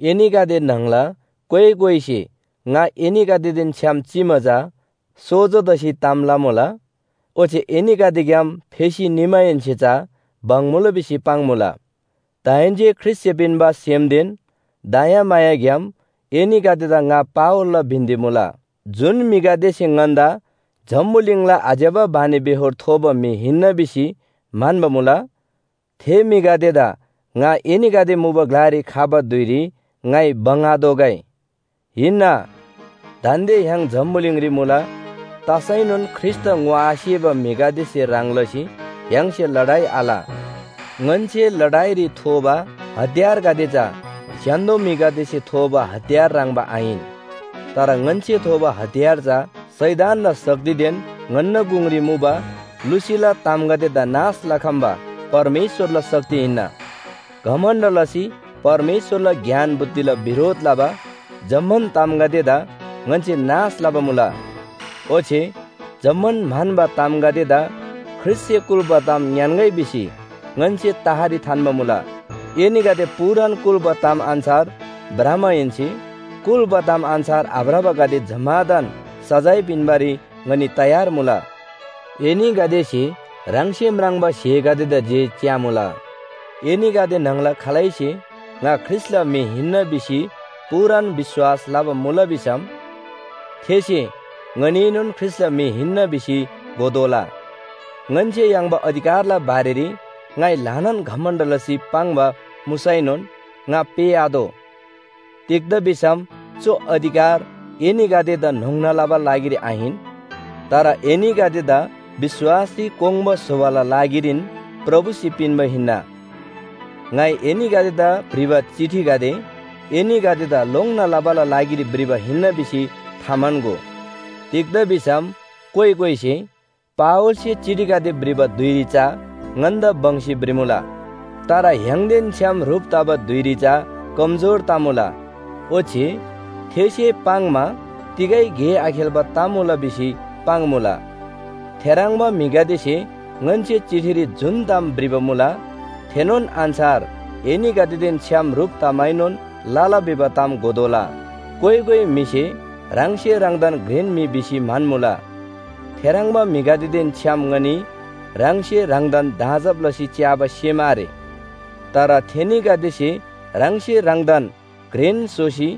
एनीगदे न्‍हङला कोइ कोइसे ङा एनीगदेदेन छ्‌याम चिमा चा सोजो तसी ताम लमुला, ओच्‍छे एनीगदेग्‍याम फेसी निमाहेन्‍से चा बङ्मुला भिसी पाङ्‌मुला। दाहेन्‍से ख्रीष्‍टसे पिन्‍बा सेमदेन दयाग्‍याम एनीगदेदा ङा पावलला बिन्‍ती मुला। जुन म्‍हिगदेसे ङन्‍दा जम्‍बुलिङला आज्‍यबा बानीबेहोर थोबा म्‍हि हिन्‍ना भिसी म्‍हन्‍बा मुला, थे म्‍हिगदेदा ङा एनीगदे मुबा ग्‍लारी खबा धुइरी ङाइ बङ्‍‌आतोःगै। हिन्‍ना, दान्‍दे य्‍हाङ जम्‍बुलिङरी मुला, तसैनोन ख्रीष्‍टदा ङोआसेबा म्‍हिगदेसे ह्रङ् लसी य्‍हाङसे लडाइ आल। ङन्‍से लडाइरी थोबा हतियारगदे चा स्‍य्‍हान्‍दो म्‍हिगदेसे थोबा हतियार ह्रङ्‌बा आहिन। तर ङन्‍से थोबा हतियार चा शैतानना शक्तिदेन ङन्‍ना गुङरी मुबा लुसीला तामगदेदा नाश लखम्‍बा परमेश्‍वरला शक्ति हिन्‍ना। घमण्‍ड लसी परमेश्‍वरला ज्ञान बुद्धिला बिरोध लबा जम्‍मान तामगदेदा ङन्‍से नाश लबा मुला। ओच्‍छे जम्‍मान म्‍हन्‍बा तामगदेदा ख्रीष्‍टसे कुल्‍बा ताम ङ्‌यान्‍गै भिसी ङन्‍से तहरी थान्‍बा मुला। एनीगदे पूरान कुल्‍बा ताम अन्‍छार भ्रमाहेन्‍से कुल्‍बा ताम अन्‍छार आभ्रबागदे जम्‍मादान सजाय पिन्‍बारी ङनी तयार मुला। एनीगदेसे ह्राङसे म्राङ्बा स्‍हेगदेदा जे च्‍यामुला। एनीगदे न्‍हङला खालैसे ङा ख्रीष्‍टला म्‍हि हिन्‍ना भिसी पूरान विश्‍वास लबा मुला भिसम थेसे ङनीएनोन ख्रीष्‍टला म्‍हि हिन्‍ना भिसी घोतोःला। ङन्‍से याङ्बा अधिकारला बारेरी ङाइ ल्‍हानान घमण्‍ड लसी पाङ्बा मुसैनोन ङा पेःआतोः। तिग्‍दा भिसम चु अधिकार एनीगदेदा न्‍होङ्ना लबाला लागिरी आहिन, तर एनीगदेदा विश्‍वासरी कोङ्बा स्‍होबाला लागिरीन प्रभुसे पिन्‍बा हिन्‍ना। ङाइ एनीगदेदा भ्रिबा चिठीगदे एनीगदेदा लोङ्‌ना लबाला लागिरी भ्रिबा हिन्‍ना भिसी थाम्‍हन्‍गो। तिग्‍दा भिसम कोइ कोइसे “पावलसे चिठीगदे भ्रिबा धुइरी चा ङन्‍दा बङ्‌सी भ्रिमुला। तर य्‍हाङदेन छ्‌याम ह्रुप तबा धुइरी चा कमजोर तमुला, ओच्‍छे थेसे पाङ्‌मा तिगै गे आखेल्‍बा तमुला” भिसी पाङ्‌मुला। थेह्रङ्बा म्‍हिगदेसे ङन्‍से चिठीरी जुन ताम भ्रिबा मुला, थेनोन अन्‍छार एनीगदेदेन छ्‌याम ह्रुप तमाएनोन लला भिबा ताम घोतोःला। कोइ कोइ म्‍हिसे ह्राङसे ह्राङदान घ्रेन म्‍हि भिसी म्‍हन्‍मुला, थेह्रङ्बा म्‍हिगदेदेन छ्‌याम ङनी ह्राङसे ह्राङदान दाँजब लसी च्‍याबा सेम आरे। तर थेनीगदेसे ह्राङसे ह्राङदान घ्रेन स्‍होसी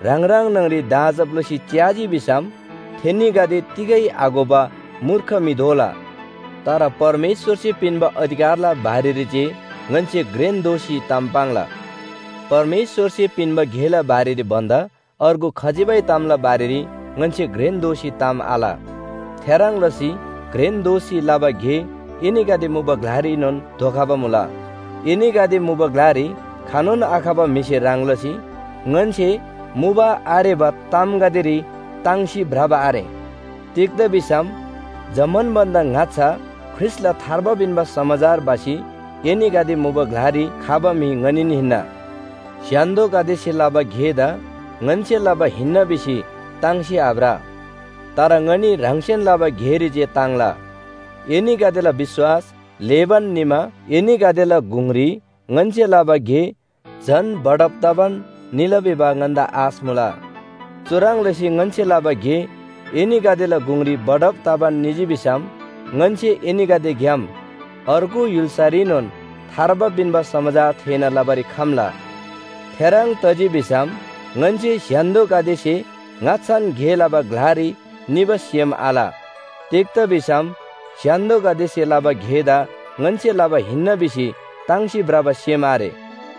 ह्राङ ह्राङ न्‍हङरी दाँजब लसी च्‍याजी भिसम थेनीगदे तिगै आघोबा मूर्ख म्‍हि दोला। तर परमेश्‍वरसे पिन्‍बा अधिकारला बारेरी जे ङन्‍से घ्रेन दोसी ताम पाङ्ला। परमेश्‍वरसे पिन्‍बा गेला बारेरी भन्‍दा अर्गु खजिबै तामला बारेरी ङन्‍से घ्रेन दोसी ताम आल। थेह्रङ् लसी घ्रेन दोसी लबा गे एनीगदे मुबा ग्‍लारीनोन धोखबा मुला। एनीगदे मुबा ग्‍लारी खनोन आखबा म्‍हिसे ह्रङ् लसी ङन्‍से मुबा आरेबा तामगदेरी ताङ्सी भ्रबा आरे। तिग्‍दा भिसम जम्‍मान भन्‍दा ङाच्‍छा ख्रीष्‍टला थार्बा पिन्‍बा समाचार भसी एनीगदे मुबा ग्‍लारी खबा म्‍हि ङनीन हिन्‍ना। स्‍य्‍हान्‍दोगदेसे लबा गेदा ङन्‍से लबा हिन्‍ना भिसी ताङ्सी आभ्र, तर ङनी ह्राङसेन लबा गेरी जे ताङ्ला। एनीगदेला विश्‍वास ल्‍हेबान निमा एनीगदेला गुङरी ङन्‍से लबा गे झन बढब तबान निला भिबा ङन्‍दा आश मुला। चुह्रङ् लसी ङन्‍से लबा गे एनीगदेला गुङरी बढब तबान निजी भिसम ङन्‍से एनीगदेग्‍याम अर्गु य्‍हुल्‍सारीनोन थार्बा पिन्‍बा समाचार थेःना लबारी खम्‍ला। थेह्रङ् तजी भिसम ङन्‍से स्‍य्‍हान्‍दोगदेसे ङाच्‍छान गे लबा ग्‍लारी निबा सेम आल। तिग्‍दा भिसम स्‍य्‍हान्‍दोगदेसे लबा गेदा ङन्‍से लबा हिन्‍ना भिसी ताङ्सी भ्रबा सेम आरे।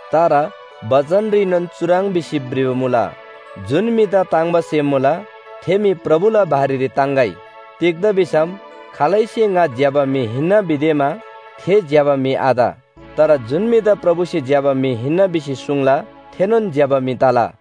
तर बचनरीनोन चुह्रङ् भिसी भ्रिबा मुला, “जुन म्‍हिदा ताङ्‍बा सेम मुला थे म्‍हि प्रभुला बारेरी ताङ्‌गै।” तिग्‍दा भिसम खालैसे ङा ज्‍यबा म्‍हि हिन्‍ना भिदेमा थे ज्‍यबा म्‍हि आत। तर जुन म्‍हिदा प्रभुसे ज्‍यबा म्‍हि हिन्‍ना भिसी सुङ्ला, थेनोन ज्‍यबा म्‍हि तला।